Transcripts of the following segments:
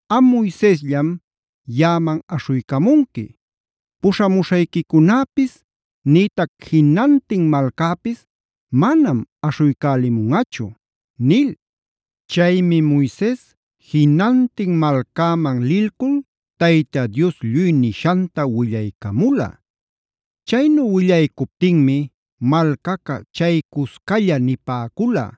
Am Moisesllam Yaꞌaman aśhuycamunqui. Puśhamuśhayquicunäpis nïtac jinantin malcäpis manam aśhuycälimunꞌachu” nil. Chaymi Moises jinantin malcäman lilcul Tayta Dios lluy nishanta willaycamula. Chaynu willaycuptinmi malcaca chaycuscalla nipäcula: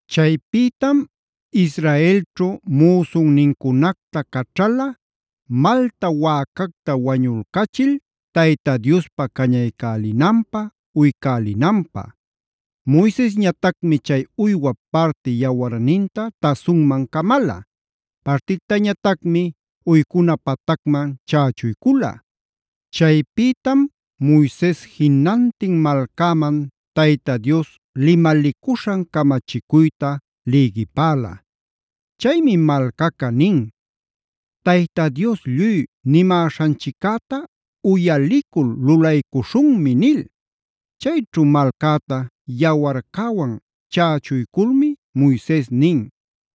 Chaypïtam Israelćhu müsunnincunacta caćhala malta wäcacta wañulcachil Tayta Diospä cañaycälinanpä, uycälinanpä. Moisesñatacmi chay uywap parti yawarninta tasunman camala. Partictañatacmi uycuna patacman chächuycula. Chaypïtam Moises jinantin malcäman Tayta Dios limalicuśhan camachicuyta lïgipäla. Chaymi malcaca nin: “Tayta Dios lluy nimäśhanchiccäta uyalicul lulaycuśhunmi” nil. Chayćhu malcäta yawarcäwan chächuyculmi Moises nin: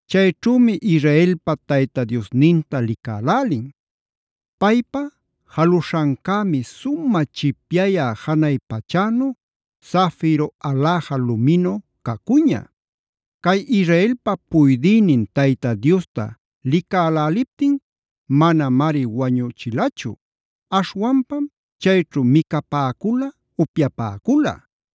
Chayćhümi Israelpa Tayta Diosninta licälälin. Paypa jaluśhancämi sumä chipyayä janay pachänu, zafiro aläja luminu cacuña. Cay Israelpa puydïnin Tayta Diosta licäläliptin manamari wañuchilachu. Aśhwanpam chayćhu micapäcula upyapäcula.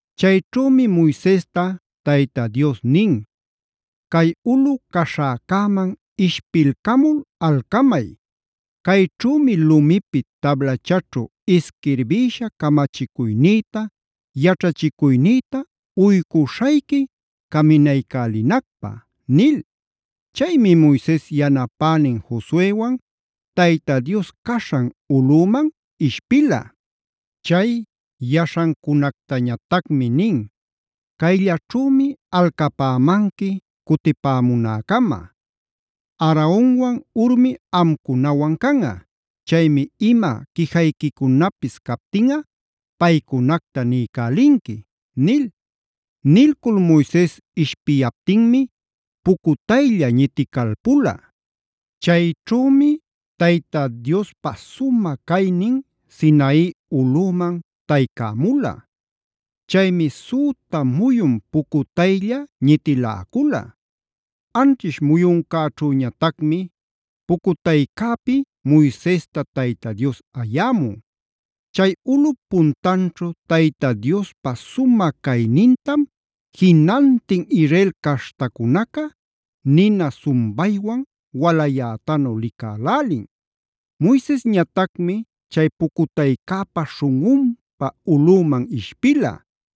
Chayćhümi Moisesta Tayta Dios nin: “Cay ulꞌu caśhäcäman ishpilcamul alcamay. Cayćhümi lumipi tablachaćhu isquirbïsha camachicuynïta, yaćhachicuynïta uycuśhayqui caminaycälinacpä” nil. Chaymi Moises yanapänin Josuewan Tayta Dios caśhan ulꞌüman ishpila. Chay yaśhancunactañatacmi nin: “Cayllaćhümi alcapämanqui cutipämunäcama. Aaronwan Hurmi amcunawan canꞌa. Chaymi ima quijayquicunapis captinꞌa paycunacta niycälinqui” nil. Nilcul Moises ishpiyaptinmi pucutaylla ñiticalpula. Chayćhümi Tayta Diospa sumä caynin Sinai ulꞌüman taycämula. Chaymi süta muyun pucutaylla ñitiläcula. Anćhish muyuncäćhüñatacmi pucutaycäpi Moisesta Tayta Dios ayämun. Chay ulꞌup puntanćhu Tayta Diospa sumä caynintam jinantin Israel caśhtacunaca nina sumbaywan walayätanu licälälin. Moisesñatacmi chay pucutaycäpa śhunꞌunpa ulꞌüman ishpila.